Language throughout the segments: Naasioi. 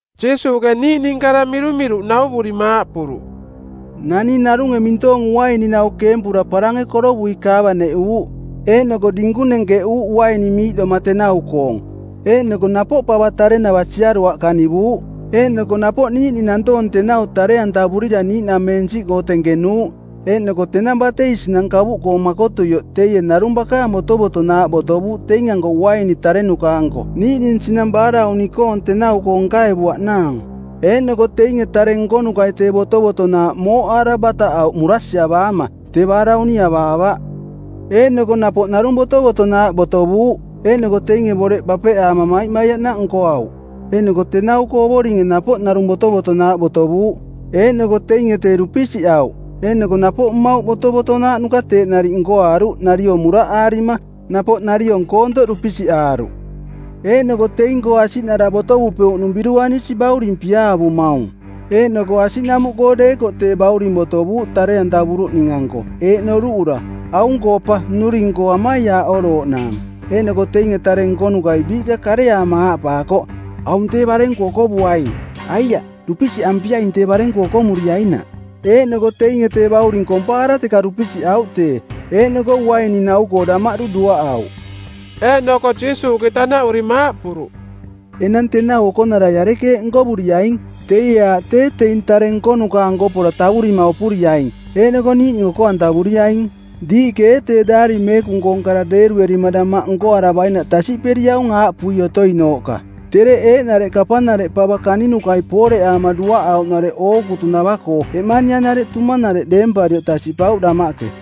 Jiisuuꞌke niiꞌning kara mirumiruꞌ nauvurima aaꞌpuruꞌ, “Naning narunge mintoong uaininau keempura parange korovui kaavaneꞌuuꞌ, eeꞌnoko dinkung nenkeꞌuuꞌ uaini miiꞌdoma tenau-koong. Eeꞌnoko napoꞌ pava tarenava siaruaꞌ kanivuuꞌ. Eeꞌnoko napoꞌ niiꞌning nantoong tenau tare-antavurira niiꞌnamensiꞌkoo tenkenuuꞌ. Eeꞌnoko tenang batei sinang kavuꞌkoong makotuioꞌ teie narung bakaang botovotonaaꞌ botovuuꞌ teing-anko uaini tarenuka-anko niiꞌning sinang baarauni-koong˜ tenau-koo nkaevuaꞌnaang. Eeꞌnoko teinge tare nkonukai tee botovotonaaꞌ mooꞌaara bataꞌauꞌ murasiavaama, tee baarauni avaavaꞌ. Eeꞌnoko napoꞌ narung botovotonaaꞌ botovuuꞌ. Eeꞌnoko teinge boreꞌ bapeꞌaama maimaiaꞌnaꞌ nkoauꞌ. Eeꞌnoko tenau-koo ovoringe napoꞌ narung botovotonaaꞌ botovuuꞌ. Eeꞌnoko teinge tee dupisiꞌauꞌ. Eeꞌnoko napoꞌ mmauꞌ botovotonaaꞌnuka teeꞌ nariꞌ nkoaaruꞌ nariong muraꞌaarima, napoꞌ nariong koontoꞌ dupisiꞌaaruꞌ. Eeꞌnoko teing-koo asiꞌnara botovupeuꞌnung biruanisi bauring piaavumaung. Eeꞌnoko asiꞌnamuꞌkoo deekoꞌ tee bauring botovuuꞌ tare-antavuruꞌning-anko eeꞌ noruꞌura, ‘Aung-koo pa nnuring-koo amaiaaꞌorooꞌnaang.’ Eeꞌnoko teinge tare nkonukai biiꞌka kareaama aaꞌpaakoꞌ, ‘Aung tee barenku okovuaing. Aiaꞌ, dupisiꞌampiaing tee barenku okomuriainaꞌ.’ Eeꞌnoko teinge tee bauring kompaara teka dupisiꞌauꞌ tee. Eeꞌnoko uaininau-koo damaꞌdu duaꞌauꞌ.” Eeꞌnoko Jiisuuꞌke tanaꞌurima aaꞌpuruꞌ, “Enang tenau okonarai arekeeꞌ nkovuriaing? Teie aaꞌ tee teing tare nkonuka-anko pora tavurima opuriaing, eeꞌnoko niiꞌning oko-antavuriaing. Diiꞌke ee tee Daari Meekung-koong kara deeruerima damaꞌ nkoaravainaꞌ tasiꞌperiaung aaꞌpui otoinooꞌka, ‘Tereꞌ eeꞌnareꞌ kapanareꞌ pava kaninukai pooreꞌaama duaꞌauꞌnareꞌ ookutunava-koo eꞌmanianareꞌ tumanareꞌ deemparioꞌ tasiꞌpauꞌ damaꞌke.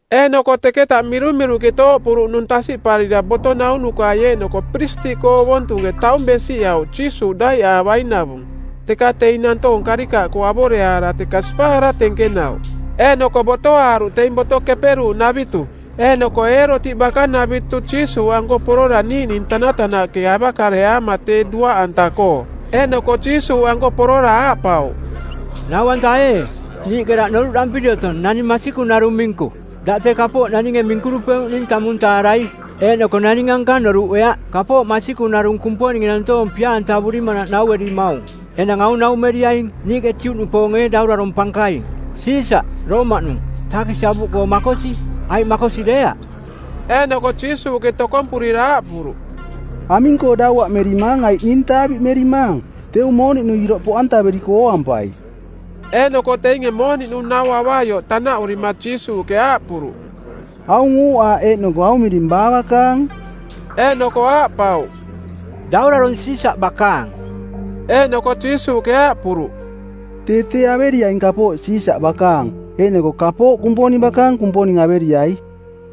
Eeꞌnoko teketa mirumiruꞌke tooꞌpuruꞌnung tasiꞌparira boto naunukai eeꞌnoko piristiꞌkoo ovontunge taung besiꞌauꞌ Jiisuuꞌ daiꞌaavainavung, teka teing nantoong karikaꞌkoo avoreaara teka sipaara tenkenauꞌ. Eeꞌnoko botoaaruꞌ teing Boto Keperuuꞌnavitu eeꞌnoko Eerotiꞌ Bakanavitu Jiisuuꞌanko porora niiꞌning tanatanaꞌke avakareaama tee duaꞌantanaꞌkoo. Eeꞌnoko Jiisuuꞌanko porora aaꞌpauꞌ, “Nau-anta ee, niiꞌke daꞌ noruꞌdampiri otong naning masikung narung minku. Daꞌ tee kapooꞌ naninge minkurupeuꞌning tamung taarai. Eeꞌnoko naning ankang noruꞌeaꞌ. Kapooꞌ masikung narung Kumponinge nantoong pia-antavurimanaꞌ nauerimaung; Enang aung naumeriaing niiꞌke Juꞌnupoonge ee daurarong˜ pankaing, Siisaꞌ˜, Roomaꞌnung, taakisi avuꞌkoo makosi, aiꞌ makosi deeaꞌ?” Eeꞌnoko Jiisuuꞌke tokompurira aaꞌpuruꞌ, “Aming-koo dauaꞌmerimaang aiꞌ ning taaviꞌmerimaang? Teu mooniꞌnu iroꞌ poꞌantaveriko ooampai.” Eeꞌnoko teinge mooniꞌnu nau avaioꞌ tanaꞌurima Jiisuuꞌke aaꞌpuruꞌ, “Aung uuꞌaaꞌ eeꞌnoko aung miring baa bakaang?” Eeꞌnoko aaꞌpauꞌ, “Daurarong Siisaꞌ bakaang.” Eeꞌnoko Jiisuuꞌke aaꞌpuruꞌ, “Tee tee averiaing kapooꞌ Siisaꞌ bakaang, eeꞌnoko kapooꞌ Kumponing bakaang Kumponing averiai.”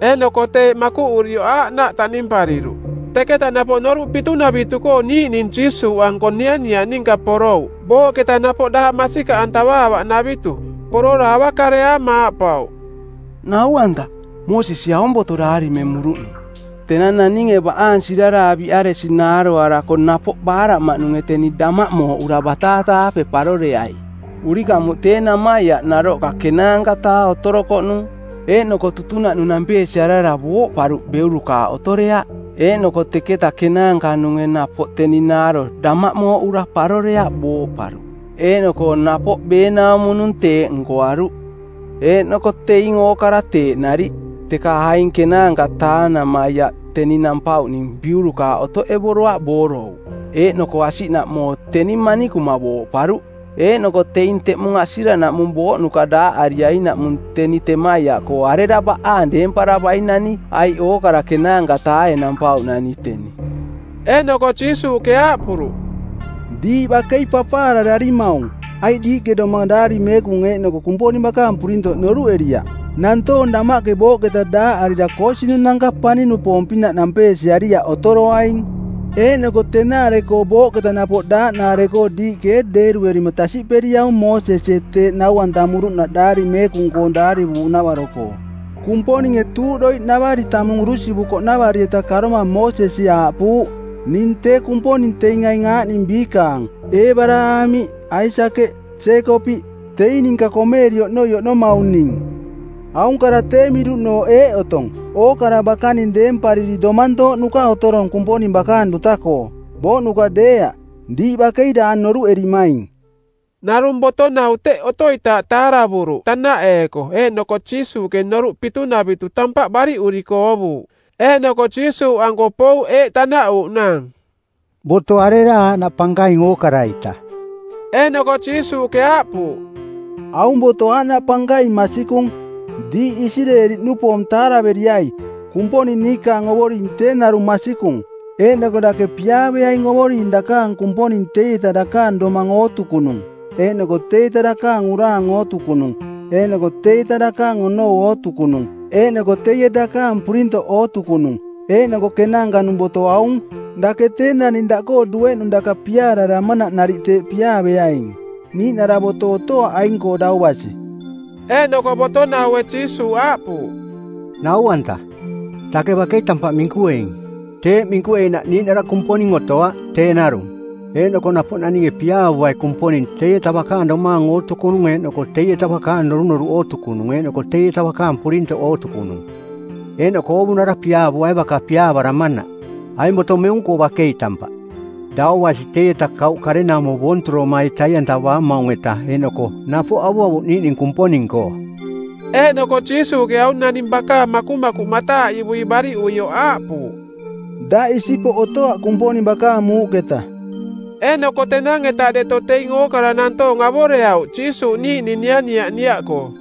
Eeꞌnoko teeꞌ makuꞌurioꞌ aaꞌnaꞌ taꞌnimpariruꞌ. Teketa napoꞌ Noruꞌ Pitunavitu˜koo niiꞌning Jiisuuꞌanko nianiaꞌ ninka porouꞌ, booꞌketa napoꞌ daaꞌ masikaꞌantavaavaꞌnavitu. Porora avakareaama aaꞌpauꞌ, “Nau-anta, Mosesie aung boto daarimemuruꞌnung, ‘Tenang naninge baꞌaang siraraaviꞌaresi naaroarako napoꞌ baaraꞌmaꞌnunge teni damaꞌ mooꞌura bataata-aape paroreai.’ Urikamuꞌ tee namaiaꞌ naroꞌka ˜kenaanka-taa otorokoꞌnung. Eeꞌnoko tutunaꞌnung nampeesiarara booꞌparuꞌ beurukaaꞌ otoreaꞌ. Eeꞌnoko teketa kenaanka-nunge napoꞌ teni naaro damaꞌmooꞌura paroreaꞌ booꞌparuꞌ. Eeꞌnoko napoꞌ beenaumo-nung teeꞌ nkoaruꞌ. Eeꞌnoko teing ookara teeꞌ nariꞌ, teka aing ˜kenaanka-taa namaiaꞌ teni nampauꞌning biurukaaꞌ otoꞌevuriaꞌ boorouꞌ, eeꞌnoko asiꞌnaꞌmoo teni manikuma booꞌparuꞌ. Eeꞌnoko teing teꞌmung asiranaꞌmung booꞌnuka daaꞌariainaꞌmung teni temaiaꞌkoo arera baꞌaang deemparavainani? Aiꞌ ookara ˜kenaanka-taae nampauꞌnani teni.” Eeꞌnoko Jiisuuꞌke aaꞌpuruꞌ, “Diiꞌ bakei papaarararimaung, aiꞌ diiꞌke doma Daari Meekung eeꞌnoko Kumponing bakaang purintoꞌ noruꞌeriaꞌ. Nantoong damaꞌke booꞌketa daaꞌarira koosinung-nanka˜ paning-nupoong-pinaꞌ nampeesiariaꞌ otoroaing. Eeꞌnoko tenaare-koo booꞌketa napoꞌ daaꞌnaare-koo diiꞌke ee deeruerima tasiꞌperiaung Moosesie teeꞌ nau-antamuruꞌnaꞌ Daari Meekung-koo daarivuuꞌnavaro-koo? Kumponinge tuuꞌdoiꞌnavari tamung urusivukoꞌnavari-eta karoma Moosesi aaꞌpuuꞌ, ‘Ning tee Kumponing teing aing aaꞌning biikaang: Eebaraamiꞌ, Aisakeꞌ, Jeekopiꞌ. Teing ninka komeeri Oꞌnoi Oꞌnomaung ning.’ Aung kara tee miruꞌnooꞌ eeꞌ otong: Ookara bakaning deempariri domantooꞌnuka otorong Kumponing bakaang duta-koo, booꞌnuka deeaꞌ. Diiꞌ bakei daang noruꞌerimaing.” Narung boto-nau teꞌ otoitaaꞌ taaravuruꞌ tanaꞌeeko, eeꞌnoko Jiisuuꞌke Noruꞌ Pitunavitu tampaꞌ bariꞌuriko oovuuꞌ. Eeꞌnoko Jiisuuꞌanko pouꞌ eeꞌ tanaꞌuuꞌnaang, “Boto arera aaꞌnaꞌ pankaing ookara-ita?” Eeꞌnoko Jiisuuꞌke aaꞌpuuꞌ, “Aung boto aaꞌnaꞌ pankaing masikung: ‘Diiꞌ Isireeli-nupoong taaraveriai, Kumponing niikaang Ovoring tee narung masikung. Eeꞌnoko dake piaaveaing Ovoring dakaang Kumponing teieta dakaang domang ootukunung eeꞌnoko teieta dakaang uraang˜ ootukunung eeꞌnoko teieta dakaang onou ootukunung eeꞌnoko teie dakaang purintoꞌ ootukunung.’ Eeꞌnoko kenaanka-nung boto aung: ‘Dake tee naning daꞌkoo dueꞌnung daka piaararamanaꞌ nariꞌ teeꞌ piaaveaing.’ Niiꞌnara boto otoaꞌ aing-koo dau basi.” Eeꞌnoko boto-naue Jiisuuꞌ aaꞌpuuꞌ, “Nau-anta, dake bakei tampaꞌ minkueing. Teeꞌ minkueinaꞌ niiꞌnara Kumponing otoaꞌ, tee narung. Eeꞌnoko napoꞌ naninge piaavuai Kumponing teieta bakaang domaang ootukunung eeꞌnoko teieta bakaang norunoruꞌ ootukunung eeꞌnoko teieta bakaang purintoꞌ ootukunung. Eeꞌnoko oovunara piaavuai baka piaavaramanaꞌ. Aing boto meung-koo bakei tampaꞌ, dau basi teieta kauꞌ karenaumo boonturomai tai-antavaamaung-eta eeꞌnoko napoꞌ avuavuꞌ niiꞌning Kumponing-koo.” Eeꞌnoko Jiisuuꞌke aung naning bakaang makumakuꞌ mataaꞌivui bariꞌuioꞌ aaꞌpuuꞌ, “Daꞌ isipoꞌ otoaꞌ Kumponing bakaang muuꞌketa.” Eeꞌnoko tenang-eta deto teing ookara nantoong avoreauꞌ Jiisuuꞌ niiꞌning nianiaꞌ niaꞌkoo.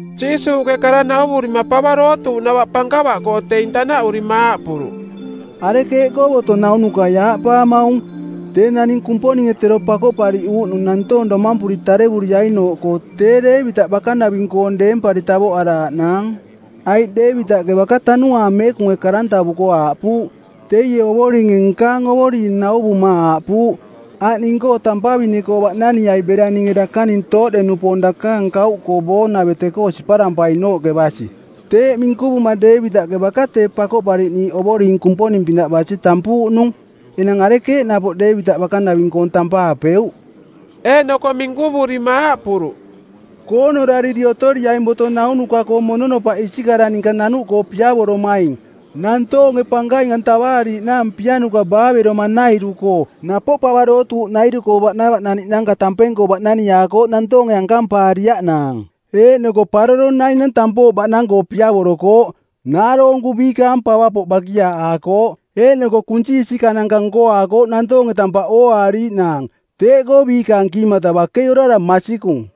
Jiisuuꞌke kara nauvurima pava dootuuꞌnava pankava-koo teing tanaꞌurima aaꞌpuruꞌ, “Arekeeꞌkoo boto naunukai aaꞌpaamaung, ‘Tee naning Kumponinge tero Pakoꞌpariꞌuuꞌnung˜ nantoong domampuri tarevuriainooꞌkoo tee Deevitaꞌ bakanaving-koong deempari tavoꞌaraaꞌnaang.’? Aiꞌ Deevitaꞌke baka Tanuaang Meekunge karantavuko˜ aaꞌpuuꞌ, ‘Teie Ovoringe nkaang Ovoring nauvuma aaꞌpuuꞌ, “Aꞌ ning-koo tampavine-koo baꞌnaniai bera ninge dakaning tooꞌde-nupoong dakaang kauꞌkoo boonavete-koo siparampainooꞌke basi.’” Teeꞌ minkuvuma Deevitaꞌke baka tee Pakoꞌpariꞌniiꞌ Ovoring Kumponing-pinaꞌ basi tampuuꞌnung. Enang arekeeꞌ napoꞌ Deevitaꞌ bakanaving-koong tampaapeuꞌ?” Eeꞌnoko minkuvurima aaꞌpuruꞌ, “Koonorariri otoriaing boto naunuka-koo mononopaꞌ isikara ninka nanuꞌkoo piavoromaing; nantoonge pankaing-antavaariiꞌnaang pianuka baaveroma-nairu-koo. Napoꞌ pava dootuuꞌnairu-koo baꞌnavaꞌnaniꞌnanka tampeng-koo baꞌnaniaakooꞌ nantoonge ankampaariaꞌnaang. Eeꞌnoko paroro nainang tampooꞌ baꞌnang-koo piavorokooꞌ. Naaroonku biikaang pavapoꞌ bakiaaꞌaakooꞌ, eeꞌnoko kunsi isikananka nkoaakooꞌ nantoonge tampaꞌ ooaariiꞌnaang. Teeꞌkoo biikaang kiimata bakei orara masikung.”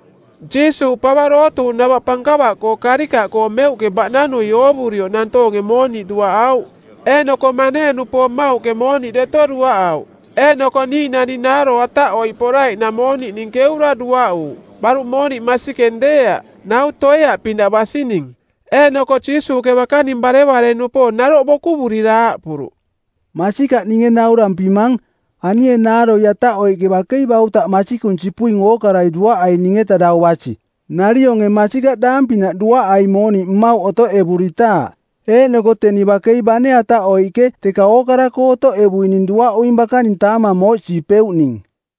Jiisuuꞌ pava dootuuꞌnava pankava-koo karikaꞌkoo meuꞌke baꞌnanui oovurioꞌ nantoonge mooniꞌ duaꞌauꞌ. Eeꞌnoko manee-nupoong mauꞌke mooniꞌ deto duaꞌauꞌ. Eeꞌnoko niiꞌnani naaro ataꞌoiꞌ poraiꞌnang mooniꞌning keura duaꞌuuꞌ, baruꞌ mooniꞌ masikeng deeaꞌ, nau toeaꞌ pinaꞌ basining. Eeꞌnoko Jiisuuꞌke bakaning barevare-nupoong naroꞌ bokuvurira aaꞌpuruꞌ, “Masikaꞌ ninge naurampimang, anie naaro ataꞌoiꞌke bakei bautaꞌ masikung sipuing ookarai duaꞌaining-eta dau basi. Narionge masikaꞌ daang-pinaꞌ duaꞌaing mooniꞌ mmauꞌ otoꞌevuritaaꞌ, eeꞌnoko teni bakei bane ataꞌoiꞌke teka ookara-koo otoꞌevuining duaꞌuing bakaning taamang mooꞌsiipeuꞌning.”